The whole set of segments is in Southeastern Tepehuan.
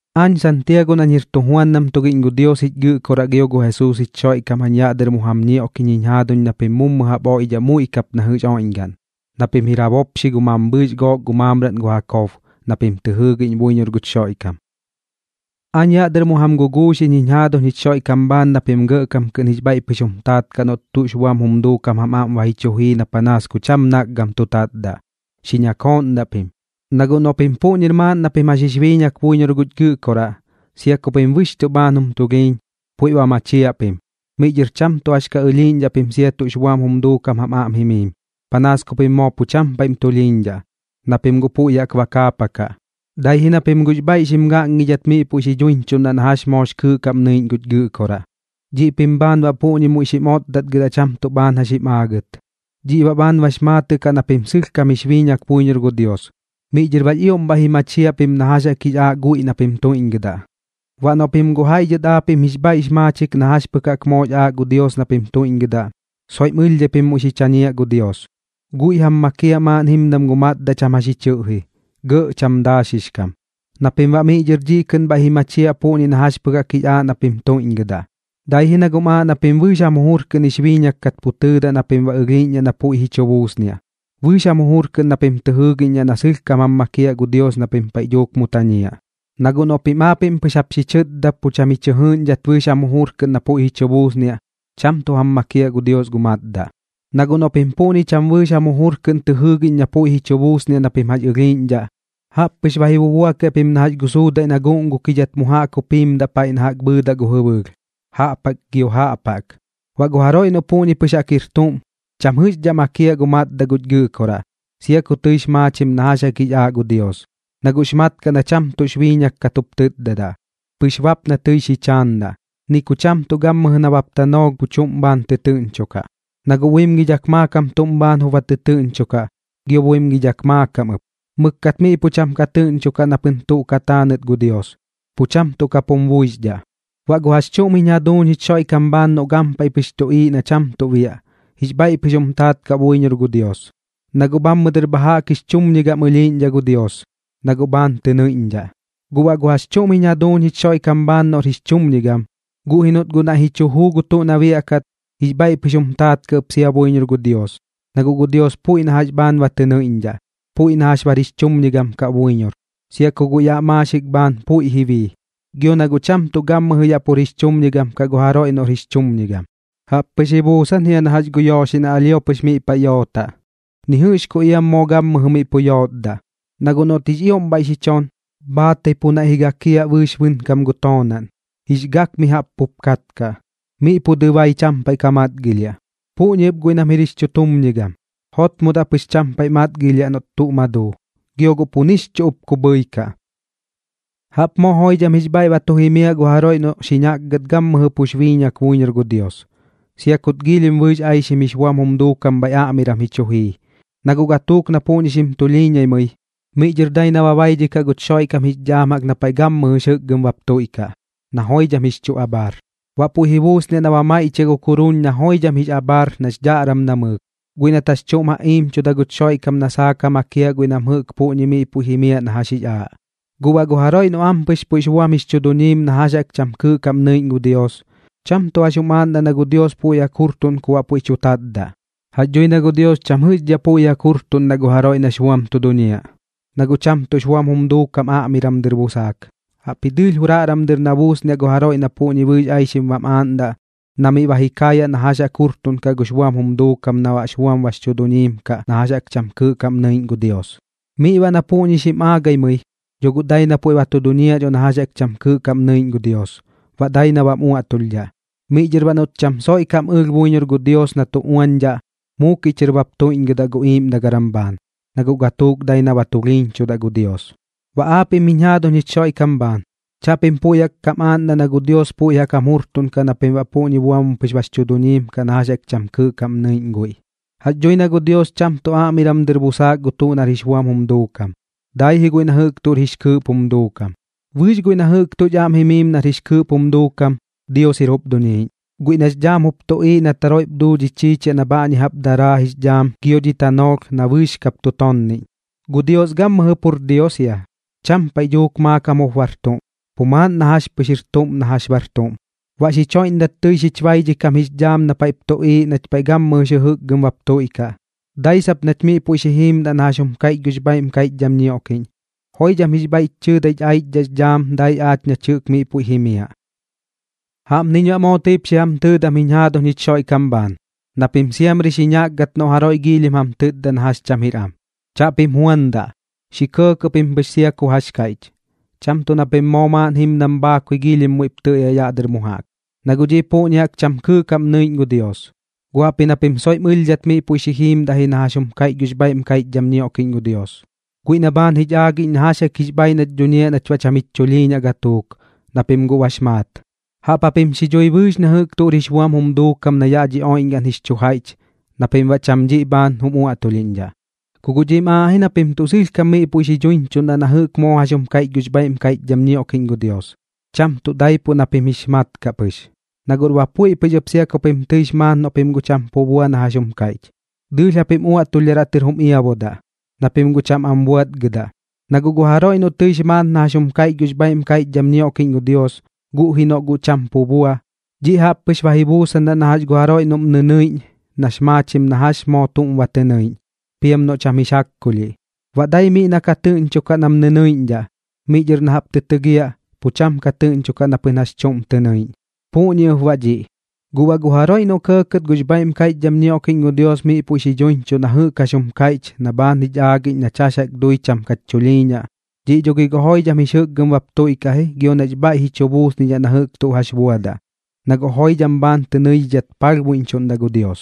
Aañ Santiago nañ jir tujuandam tugiꞌñ gu Dios jich Gɨꞌkoraꞌ gio gu Jesuus jich Xoiꞌkam jañ yaꞌ dɨr mu jam ñioꞌkiꞌñ jiñ jaaduñ na pim mummu jaꞌp oiꞌdhaꞌ muiꞌ kap na jɨꞌx oiꞌñgaꞌn, na pim jir ja bopxi gu mambhɨɨx gook gu maamraꞌn gu Jakob, na pim tɨ jɨɨgiꞌñ buiñor guch Xoiꞌkam. Aañ yaꞌ dɨr mu jam guguuxiꞌñ jiñ jaaduñ jich Xoiꞌkam bhaan na pim gɇꞌkam kɨꞌn jix bhaiꞌ pɨx jum taat kaꞌ noꞌt tuꞌx buam jum duukam jam aꞌm ba ji chu jii na panaas ku cham nakgam tu tatdaꞌ. Xi ñakooꞌndaꞌ pim, na guꞌ noꞌ pim puꞌñir maaꞌn na pim jax jix biiñak buiñor guch Gɨꞌkoraꞌ, sia ku pim bɨxchuꞌ bhaan jum tulhiiñ, puiꞌ ba machiaꞌ pim. Miꞌ dhɨr cham tuꞌ jax ka ɨlhiiꞌñdhaꞌ pim sia tuꞌx buam jum duukam jam aꞌm jimiim, panaas ku pim moo pu cham tuꞌm tulhiiñdhaꞌ, na pim guꞌ puiꞌ jaꞌk ba kaapakaꞌ. Dai ji na pim guꞌx bhaiꞌ xim gaꞌngidhat miꞌ puiꞌ duiñchuꞌndaꞌ na jax moox kɨɨꞌ kaꞌm nɨiꞌñ guch Gɨꞌkoraꞌ, dhiꞌ pim bhaan baꞌ puꞌñi muiꞌ xim otdatgɨdaꞌ cham tuꞌ bhaan jax jim aagɨt. Dhiꞌ baꞌ bhaan bax maatɨꞌ kaꞌ na pim sɨlhkam jix biiñak buiñor gu Dios, miꞌ dhɨr baꞌx ioꞌm bhaiꞌ ji machiaꞌ pim na jax jaꞌk jix aaꞌ guiꞌ na pim tuiꞌñgɨdaꞌ. Baꞌ noꞌ pim guꞌ jaiꞌ dhɨt aapiꞌm jix bhaiꞌx maachik na jax pɨk jaꞌk moox aaꞌ gu Dios na pim tuiꞌñgɨdaꞌ, soiꞌm ɨlhdhai pim muiꞌ xi chañiaꞌ gu Dios. Guiꞌ jam makiaꞌ maaꞌn jimdam gu matdaꞌ cham jax ji chɨꞌji, gɇꞌ cham daaxix kam, na pim baꞌ miꞌ dhɨr kɨꞌn bhaiꞌ ji machiaꞌ puꞌñi na jax pɨk jaꞌk jix aaꞌ na pim tuiꞌñgɨdaꞌ. Dai ji na guꞌm aaꞌ na pim bɨɨx jam jujur kɨꞌn jix biiñak kat pu tɨɨdaꞌ na pim ba ɨlhiiꞌñdhaꞌ na puiꞌ ji chu buusniaꞌ, bɨɨx jam jujur kɨꞌn na pim tɨ jɨɨgiꞌñdhaꞌ na sɨlhkam jam makiaꞌ gu Dios na pim paiꞌ dhuuk mu tañiaꞌ. Na guꞌ noꞌ pim aapiꞌm pɨx bap xi chɨtda pu cham ji chɨ jɨɨꞌñdhat bɨɨx jam jujur kɨꞌn na puiꞌ ji chu buusniaꞌ, cham tuꞌ jam makiaꞌ gu Dios gu matdaꞌ. Na guꞌ noꞌ pim puꞌñi cham bɨɨx jam jujur kɨꞌn tɨ jɨɨgiꞌñ na puiꞌ ji chu buusniaꞌ na pim jax ɨlhiiꞌñdhaꞌ, jaꞌp pɨx ba ji bubuakiaꞌ pim na jax gu suudaiꞌ na guꞌngukidhat mu jaꞌk jup jimdaꞌ paiꞌ na jaꞌk bhɨɨdaꞌ gu jɨbɨɨlh, jaꞌp jaꞌk gio jaꞌp jaꞌk. Baꞌ gu jaroiꞌ noꞌ puꞌñi jaꞌk pɨx jir tuꞌm, cham jɨꞌxdhaꞌ makiaꞌ gu matdaꞌ guch Gɨꞌkoraꞌ, sia ku tɨix maachim na jax jaꞌk jix aaꞌ gu Dios, na guꞌx mat kaꞌ na cham tuꞌx biiñak kat jup tɨtdadaꞌ, pɨx bap na tɨi xi chaandaꞌ. Ni ku cham tuꞌ gammɨjɨ nabap tanoolh pu chuꞌm bhaan tɨtɨɨꞌñchokaꞌ, na guꞌ buimgidhak maakam tuꞌm bhaan jup ba tɨtɨɨꞌñchokaꞌ, gio buimgidhak maakam ɨp. Mɨkkat miꞌ pu cham ka tɨꞌñchokaꞌ na pɨn tuꞌ ka taanɨt gu Dios, pu cham tuꞌ kap jum buixdhaꞌ. Baꞌ gu jax chuꞌm jiñ jaduuñ jich Xoiꞌkam bhaan noꞌ gampaiꞌ pɨx tuꞌiiꞌ na cham tuꞌ biaꞌ, jix bhaiꞌ pɨx jum taat kaꞌ buiñor gu Dios, na guꞌ bhammɨ dɨr bha jaꞌk jix chumñigam ɨlhiiꞌñdhaꞌ gu Dios, na guꞌ bhaan tɨ nɨiꞌñdhaꞌ. Guꞌ baꞌ gu jax chuꞌm jiñ jaduuñ jich Xoiꞌkam bhaan noꞌr jix chumñigam, guꞌ ji noꞌt guꞌ naiꞌ ji chu juu gu tuꞌ na biaꞌkat, jix bhaiꞌ pɨx jum taat kaꞌ ɨp sia buiñor gu Dios, na guꞌ gu Dios puiꞌ na jax bhaan ba tɨ nɨidhidhaꞌ, puiꞌ na jax bar jix chumñigam kaꞌ buiñor, sia ku guꞌ yaꞌ gu maaxik bhaan puiꞌ ji bii. Gio na guꞌ cham tuꞌ gammɨjɨ yaꞌ pur jix chumñigam kaꞌ gu jaroiꞌ noꞌr jix chumñigam. Jaꞌp pɨx ji buusan jia na jax gu yooxiꞌ na alhio pɨx mu paiꞌ yootaꞌ, ni jɨꞌx ku iam moo gammɨjɨ miꞌ pu yootdaꞌ. Na guꞌ noꞌt jix ioꞌm bhaiꞌ xi chon, bhaatai pu naiꞌ ji gakiaꞌ bɨɨx bɨnkam gu toonaꞌn, jix gak mi jaꞌp pup katkaꞌ, miꞌ pu dɨbai cham paiꞌ ka matgilhiaꞌ. Puꞌñi ɨp guiꞌ nam jir jix chutumñigam, jotmodaꞌ pɨx cham paiꞌ matgilhiaꞌ noꞌt tuꞌ ma duu, gio guꞌ pu nix chuꞌ ɨp ku bhɨikaꞌ. Jaꞌp moo joidham jix bhaiꞌ ba tu jimiaꞌ gu jaroiꞌ noꞌ xi ñakgat gammɨjɨ pux biiñak buiñor gu Dios, sia kut giilhim bɨɨx aixim jix buam jum duukam bhaiꞌ aꞌmiram ji chu jii, na guꞌ gatuuk na puꞌñi xim tulhiiñaimɨi, miꞌ dhɨr dai na ba baidhikaꞌ guch Xoiꞌkam jix dhaam jaꞌk na paiꞌ gammɨjɨ jix jɨkgɨm bap tuiꞌkaꞌ, na joidham jix chu abhaar. Baꞌ puiꞌ ji buusniaꞌ na ba maiꞌchiaꞌ gu kuruun na joidham jix abhaar nax dhaꞌram namɨɨk, guiꞌ nat jax chuꞌm ja iimchuda guch Xoiꞌkam na saak ja makiaꞌ guiꞌ nam jɨꞌk puꞌñi miꞌ puiꞌ jimiaꞌ na jax jix aaꞌ. Guꞌ baꞌ gu jaroiꞌ noꞌ ampɨx puiꞌx buam jix chu duñiim na jax jaꞌk cham kɨɨꞌ kaꞌm nɨiꞌñ gu Dios, cham tuꞌ jax jum aaꞌndaꞌ na gu Dios puiꞌ jaꞌk jurtuꞌn ku baꞌ puiꞌ tu tatdaꞌ. Jax dhui na gu Dios cham jɨꞌxdhaꞌ puiꞌ jaꞌk jurtuꞌndaꞌ gu jaroiꞌ nax buam tu duñiaꞌ, na guꞌ cham tuꞌx buam jum duukam aꞌmiram dɨr busaak. Jaꞌpji dɨɨlh juraꞌram dɨr na buusniaꞌ gu jaroiꞌ na puꞌñi bɨɨx aixim bam aaꞌndaꞌ, na miꞌ ba ji kaayaꞌ na jax jaꞌk jurtuꞌnkaꞌ gux buam jum duukam na baꞌx buam bax chu duñiim kaꞌ na jax jaꞌk cham kɨɨꞌ kaꞌm nɨiꞌñ gu Dios. Miꞌ baꞌ na puꞌñi xim aagaimɨi, dho guꞌ dai na puiꞌ ba duñiaꞌ dho na jax cham kɨɨꞌ kaꞌm nɨiꞌñ gu Dios, baꞌ dai na bam uaꞌtulhdhaꞌ. Miꞌ dhɨr baꞌ noꞌt cham soiꞌ kam ɨlh buiñor gu Dios na tu uañdhaꞌ, muukiꞌ chɨr bap tuiꞌñgɨdaꞌ gu iiꞌmdagaram bhaan, na guꞌ gatuuk dai na ba tulhiiñchudaꞌ gu Dios. Baꞌ aapiꞌm jiñ jaaduñ jich Xoiꞌkam bhaan, chaꞌpim puiꞌ jaꞌk kam aaꞌndaꞌ na gu Dios puiꞌ jaꞌk jam jurtuꞌnkaꞌ na pim baꞌ puꞌñi buam pɨx jix chu duñiim kaꞌ na jax jaꞌk cham kɨɨꞌ kaꞌm nɨiꞌñ guiꞌ. Jax dhui na gu Dios cham tuꞌ aꞌmiram dɨr busaak gu tuꞌ nar jix buam jum duukam, dai ji guiꞌ na jɨꞌk tuꞌr jix kɨɨꞌp jum duukam. Bɨɨx guiꞌ na jɨꞌk tuꞌch aꞌm jimiim nar jix kɨɨꞌp jum duukam, Dios jir jup duniiꞌñ, guiꞌ nax dhaam jup tuꞌiiꞌ nat jaroiꞌp duu dhi chiichiaꞌ na bhaꞌñi jaꞌp daraa jix dhaam gio dhi tanoolh na bɨɨx kap tu toonniꞌñ. Gu Dios gammɨjɨ pur Dios jia, cham paiꞌ dhuuk maakam jup bar tuꞌm, pu maaꞌn na jax pɨx jir tuꞌm na jax bar tuꞌm. Baꞌ xich joiꞌndat tɨi xich baidhikam jix dhaam na paiꞌp tuꞌiiꞌ nach paiꞌ gammɨjɨ jix jɨjɨkgɨm bap tuiꞌkaꞌ, dai sap nach miꞌ puiꞌ xi jiimdaꞌ na jax jum kaiꞌch gux bhaiꞌm kaiꞌchdham ñioꞌkiꞌñ. Joidham jix bhaiꞌch chɨɨdai jich aichdhaꞌx dhaam dai aach nach jɨꞌk miꞌ puiꞌ jimiaꞌ. Jaꞌpniñ baꞌ moo tɨip xi jam tɨɨdam jiñ jaaduñ jich Xoiꞌkam bhaan, na pim siamri xi ñakgat noꞌ jaroiꞌ giilhim jam tɨtda na jax cham jir am. Chaꞌpim juandaꞌ, xi kɇɇkɇꞌ pim pɨx sia ku jax kaiꞌch. Cham tuꞌ na pim moo maaꞌn jimdam bhaakui giilhim muiꞌp tɨɨdaꞌ yaꞌ dɨr mu jaꞌk, na guꞌ dhiꞌ puꞌñi jaꞌk cham kɨɨꞌ kaꞌm nɨiꞌñ gu Dios. Gu jaꞌpji na pim soiꞌm ɨlhdhat miꞌ puiꞌ xi jiimdaꞌ ji na jax jum kaiꞌch gux bhaiꞌm kaiꞌchdham ñioꞌkiꞌñ gu Dios, guiꞌ na bhaan jich aagiꞌñ na jax jaꞌk jix bhaaiꞌ nach duñiaꞌ nach baꞌ cham jich chulhiiñaꞌ gatuuk, na pim guꞌ bax maat. Jaꞌp japim xi dhui bɨɨx na jɨꞌk tuꞌr jix buam jum duukam na yaꞌ dhi oiꞌñgaꞌn jix chu jaiꞌch na pim baꞌ cham dhiꞌ bhaan jum uaꞌtulhiꞌñdhaꞌ. Ku guꞌ dhiꞌm aaꞌ ji na pim tuꞌ sɨlhkam miꞌ puiꞌ xi dhuiñchuꞌndaꞌ na jɨꞌk moo jax jum kaiꞌch gux bhaiꞌm kaiꞌchdham ñioꞌkiꞌñ gu Dios, cham tuꞌ daipuꞌ na pim jix mat kaꞌ pɨx. Na guꞌr ba puiꞌ pɨx ɨp sia pim tɨix maat noꞌ pim guꞌ cham pu bua na jax jum kaiꞌch, dɨɨlh japim uaꞌtulhdharaꞌ tɨr jum iabudaꞌ, na pim guꞌ cham am buatgɨdaꞌ. Na guꞌ gu jaroiꞌ noꞌ tɨix maat na jax jaꞌk jum kaiꞌch gux bhaiꞌm kaiꞌchdham ñioꞌkiꞌñ gu Dios, guꞌ ji noꞌ guꞌ cham pu bua, dhiꞌ jaꞌpni pɨx ba ji buusan na jax gu jaroiꞌ noꞌm nɨnɨiꞌñ nax maachim na jax moo tuꞌm ba tɨ nɨiꞌñ, piam noꞌ cham jix jaꞌkkulhiꞌ. Baꞌ dai miꞌ na ka tɨꞌñchokaꞌ na kam nɨnɨiꞌñdhaꞌ, miꞌ dhɨr na jaꞌp tɨ tɨgiaꞌ, pu cham tuꞌ ka tɨꞌñchokaꞌ na pɨn jax chuꞌm tɨ nɨiꞌñ. Puꞌñi ɨp baꞌ dhiꞌ. Guꞌ baꞌ gu jaroiꞌ noꞌ kɇɇkɇt gux bhaiꞌm kaiꞌchdham ñioꞌkiꞌñ gu Dios miꞌ puiꞌ xi dhuiñchuꞌ na jɨꞌk jax jum kaiꞌch na bhaan jich aagiꞌñ nach jax jaꞌk dui cham kach chulhiiñaꞌ, dhiꞌ dho gi guꞌ joidham jix jɨkgɨm bap tuiꞌkaꞌ ji gio nax bhaiꞌ ji chu buusnidhaꞌ na jɨꞌk tuꞌ jax buadaꞌ, na guꞌ joidham bhaan tɨ nɨidhidhat palhbuiꞌñchuꞌndaꞌ gu Dios.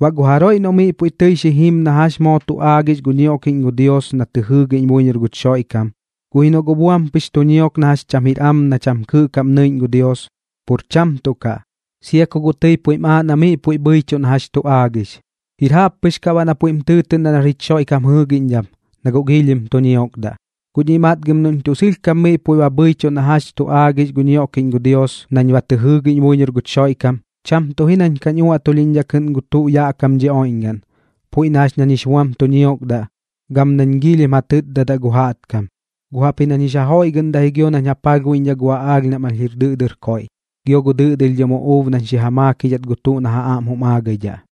Baꞌ gu jaroiꞌ noꞌ miꞌ puiꞌ tɨi xi jim na jax moo tu aagix gu ñioꞌkiꞌñ gu Dios na tɨ jɨɨgiꞌñ buiñor guch Xoiꞌkam, guꞌ ji noꞌ guꞌ buam pɨx tu ñiok na jax cham jir am na cham kɨɨꞌ kaꞌm nɨiꞌñ gu Dios, pur cham tuꞌ kaꞌ, sia ku guꞌ tɨi puiꞌm aaꞌ na miꞌ puiꞌ bhɨichuꞌ na jax tu aagix, jir jaꞌp pɨx kaꞌ baꞌ na puiꞌm tɨɨtɨꞌndaꞌ nar jich Xoiꞌkam jɨɨgiꞌñdham, na guꞌ giilhim tu ñiokdaꞌ. Guꞌ dhiꞌ matgam noꞌñ tuꞌ sɨlhkam miꞌ puiꞌ ba bhɨichuꞌ na jax tu aagix gu ñioꞌkiꞌñ gu Dios nañ ba tɨ jɨɨgiꞌñ buiñor guch Xoiꞌkam, cham tuꞌ ji nañ kañ uaꞌtulhiꞌñdhaꞌ kɨꞌn gu tuꞌ yaꞌ kam dhi oiꞌñgaꞌn, puiꞌ na jax nañ jix buam tu ñiokdaꞌ gam nañ giilhim ja tɨtdadaꞌ gu jaꞌtkam, guꞌ jaꞌpji nañ jix ja joiꞌgɨꞌndaꞌ ji gio nañ ja palhbuiꞌñdhaꞌ gu aꞌaalh nam alh jir dɨꞌdɨr koiꞌ, gio gu dɨꞌdɨlhdhɨm uꞌuub nañ xi ja maakidhat gu tuꞌ na ja aꞌm jum aagaidhaꞌ.